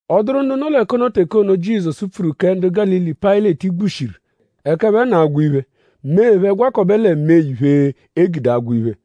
Ọ dụru ndu nọ l'ẹka ono teke ono, pfuru Jizọsu kẹ ndu Gálili, Payịleti gbushiru ẹka ẹphe nọ agwa iphe; mee phẹ gwakọbe lẹ mee iphe, e gude agwa iphe.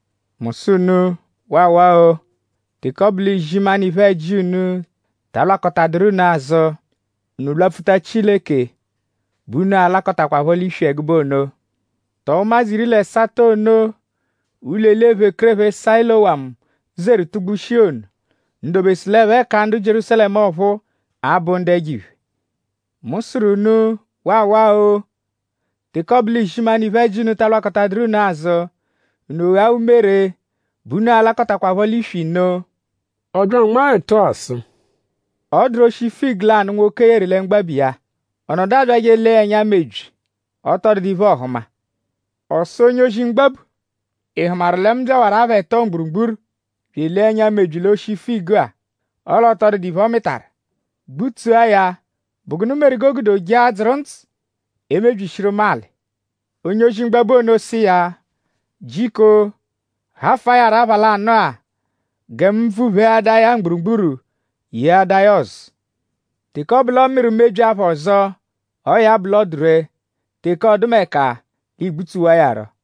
Mu sụ unu: Waawaa-o! Teke ọ bụ l'izimanụ iphe-ẹji unu ta alwakọtaduru unu azụ; unu lwapfuta Chileke bẹ unu a-lakọtakwapho l'iswi ẹgube ono. Tọo ụmadzu iri l'ẹsato ono, ụlo-eli ephekerephe Sayilowamu zeru tugbushia ono;?unu dobesu l'ẹphe ka ndu Jierúsalẹmu ọphuu abụ ndu ẹjo-iphe? Mu sụru unu: Waawaa-o! Teke ọ bụ l'izimanụ iphe-ẹji unu ta lwakọtaduru unu azụ; unu ghaa umere bẹ unu a-lakọtakwapho l'iswi nno.” Ọ bya anmaa ẹtu-a sụ: “Ọ dụru oshi figu lanụ, nwoke yeru lẹ mgbabu iya. Ọ nọdu abyajẹ elee ya ẹnya mebyi; ọ tọ dụdu iphe, ọohuma. Ọ sụ onye-ozi mgbabu: ‘?Ị hụmaru lẹ mu byawaru apha ẹto mgburugburu bya elee ẹnya mebyi l'oshi figu-a: ọle ọ tọ dụdu iphe, ọ mịtaru. Gbutsua ya!?Bụ gụnu meru g'o gude o jee adzụru ndzụ emebyishiru mu alị?’ Onye-ozi mgbabu ono sụ iya: ‘Jiko hafụa ya rọ apha lanụ-a; gẹ mu bvupheadaa ya mgburugburu yeadaa ya ọzu. Teke ọ bụ l'ọ mịru mebyi apha ọzo; ọo ya bụ l'ọ dụ ree; teke ọdumeka l'ii-gbutsuwa iya rọ.’”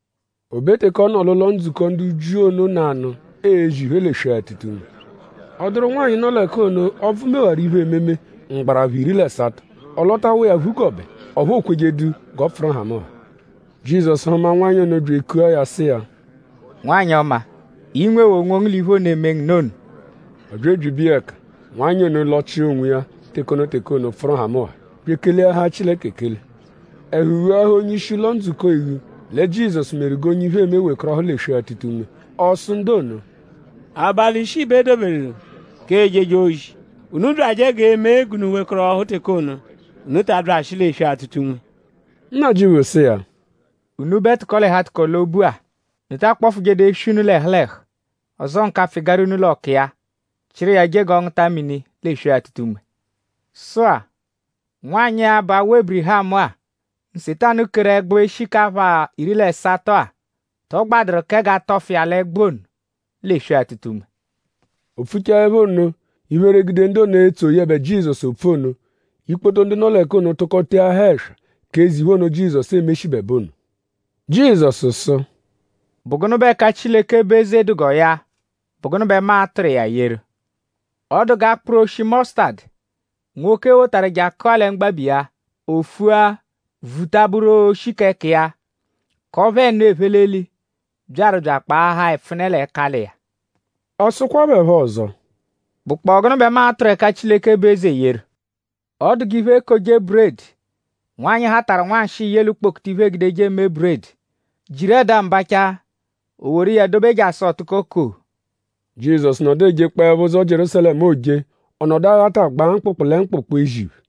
O be teke ọ nọ l'ụlo-ndzukọ ndu Jiu ono nanụ ezi iphe l'eswe-atụta-unme; ọ dụru nwanyị, nọ l'ẹka ono, ọbvu mewaru iphe-ememe mgbarapha iri l'ẹsato. Ọ lọtawa iya phugọbe; ọphu o kwejẹdu g'ọ pfụru nhamụnha. Jizọsu hụma nwanyị ono bya ekua ya sụ iya: “Nwanyị ọma! I nwewaa onwongu l'iphe ono, eme ngu nụ ono!” Ọ bya ebyibe iya ẹka; nwanyị ono lọchia onwiya teke ono teke ono pfụru nhamụnha; bya ekeleahaa Chileke ekele. Ẹhu ghuahaa onye-ishi ụlo-ndzukọ eghu lẹ Jizọsu meru g'onye iphe eme wekọrohu l'eswe-atụta-unme. Ọ sụ ndu ono: “Abalị ishii bẹ e doberu k'ejeje ozi; unu byajẹ g'e mee g'unu wekọrohu teke ono; unu ta abyajẹshi l'eswe-atụta-unme.” Nnajịuphu sụ iya: “Unubẹ tụko-l'ẹhu-atụko-l'obu-a!?Unu ta akpọfujedu eswi unu l'ẹhu l'ẹhu; ọzoo nkapfụ-ịgara unu l'ọka iya; chịru iya je g'ọ ngụta mini l'eswe-atụta-unme? Sụ-a; nwanyị-a, bụ awa Ébirihamu-a, Nsetanu keru ẹgbu eshi k'apha iri l'ẹsato-a;?tọ gbadụru kẹ g'a tọfu iya l'ẹgbu ono l'eswe-atụta-unme?” O pfuchaẹpho nno; iphere gude ndu ono, etso yẹbe Jizọsu opfu ono. Ikpoto ndu nọ l'ẹka ono tụko teahaa ẹswa k'eze iphe ono, Jizọsu emeshibẹbe ono. Jizọsu sụ: “?Bụ gụnu bẹ ẹka Chileke bụ eze dụ g'ọ ya??Bụ gụnu bẹ mu a-tụru iya yeru? Ọ dụ g'akpụru oshi mọsutadu, nwoke wotaru je akụa lẹ mgbabu iya. O fua; vuta bụru oshi k'ẹka iya; k'ọphu ẹnu, ephe l'eli byaru bya akpaahaa ẹpfune l'ẹkali iya.” Ọ sụkwa phẹ phọ ọzo: “?Bụkpoo gụnu bẹ mu a-tụru ẹka Chileke bụ eze yeru? Ọ dụ g'iphe-ekoje-buredi, nwanyị hatarụ nwanshịi ye l'ukpokutu iphe, eegudeje eme buredi, jiru ẹda-mbacha; o woru iya dobe jasụ ọ tụko koo.” Jizọsu nọdu ejekpọepho ụzo Jierúsalẹmu, ooje. Ọ nọdu aghatagbaa mkpụkpu lẹ mkpụkpu ezi iphe.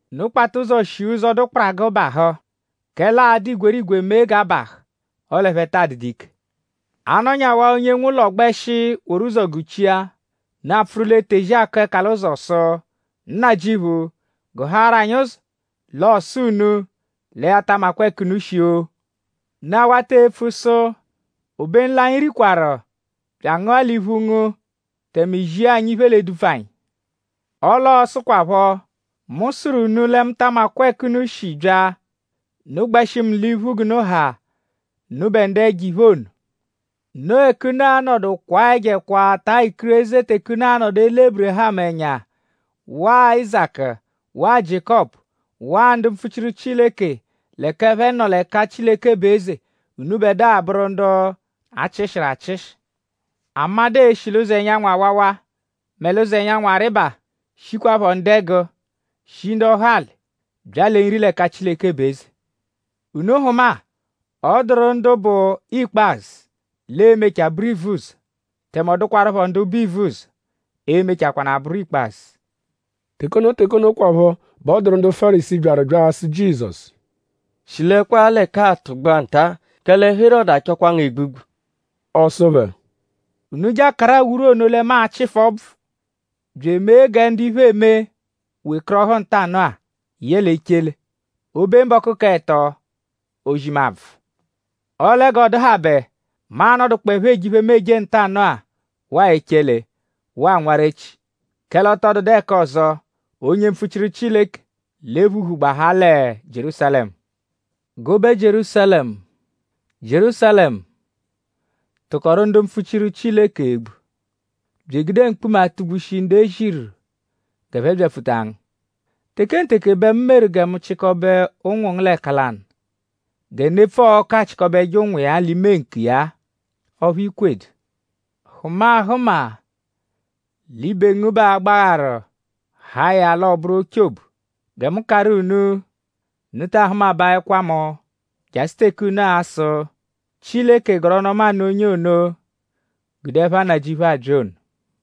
“Unu kpata ụzo shia ụzo, dụ kparagụ bahụ; kẹle aa-dụ igwerigwe mee g'a bahụ; ọle ẹphe taa dụdu ike. A -nọnyawaa onye nwe ụlo gbẹshi woru ụzo guchia; unu apfụru l'etezi akụ ẹka l'ụzo sụ: ‘Nnajịuphu; gụhaaru anyi ụzo!’ L'ọo sụ unu lẹ ya ta amakwa ẹka unu shi-o! Unu awata epfu sụ: ‘Obenu l'anyi rikwaru; bya angụa l'iphu ngu; tẹme i zia iphe l'edupfu anyi.’ Ọle ọo-sụkwapho: ‘Mu sụru unu lẹ mu ta amadụ ẹka unu shi bya; unu gbẹshi mu l'iphu g'unu ha; unubẹ ndu ẹjo-iphe ono!’ Noo ẹka unu a-nọdu kwaa ẹjo ẹkwa; taa ikireze teke unu a-nọdu ele Ébirihamu ẹnya; waa Áyizaku; waa Jiékọpu; waa ndu mpfuchiru Chileke l'ẹka ẹphe nọ l'ẹka Chileke bụ eze; unubẹdua bụru ndu a chịshiru achịshi. Amadụ e-shi l'ụzo ẹnyanwu awawa mẹ l'ụzo, ẹnyanwu arịba; shikwaphọ ndẹgu; shi ndọhali; bya lẹ nri l'ẹka Chileke bụ eze. Unu hụma-a; ọ dụru ndu bụ ikpazụ, l'e-mechaa bụru ivuzọ; tẹme ọ dụkwarupho ndu bụ ivuzọ, e-mechakwanaa bụru ikpazụ.” Teke ono teke onokwaphọ bẹ ọ dụru ndu Fárisii, byaru bya asụ Jizọsu: “Shilẹkwaa l'ẹka-a tụgbua nta; kẹle Herọdu achọkwa ngu egbugbu.” Ọ sụ phẹ: “Unu je akaru awuru ono lẹ mu achịfu ọbvu; bya eme gẹ ndu iphe eme wekọrohu ntanụ-a yẹle echele; o -be mbọku k'ẹto; ozi mu abvụ. Ọle g'ọ dụhabe; mu a-nọdukpoepho eje iphe, mu eje ntanụ-a; waa echele; waa nwarechi; kẹle ọ tọ dụdu ẹka ọzo, onye mpfuchiru Chileke l'e-phuhu gbahaa lẹ Jierúsalẹmu! “Gụbe Jierúsalẹmu; Jierúsalẹmu, tụkoru ndu mpfuchiru Chileke egbu; bya egude mkpuma atụ-gbushi ndu e ziru g'ẹphe byapfuta ngu. Tekenteke bẹ mu meru gẹ mu chịkobe ụnwu ngu l'ẹka lanụ gẹ nepfu-ọku achịkobeje ụnwu iya l'ime ǹkù iya-a; ọphu i kwedu! Hụma ahụma; l'ibe ngu bẹ aa-gbagharu haa ya l'ọ bụru ochobu! Gẹ mu karụ unu: unu taa hụmabaekwa mu jasụ teke unu a-sụ: ‘Chileke gọru ọnu-ọma nụ onye ono, gude ẹpha Nnajịuphu abya ono.’”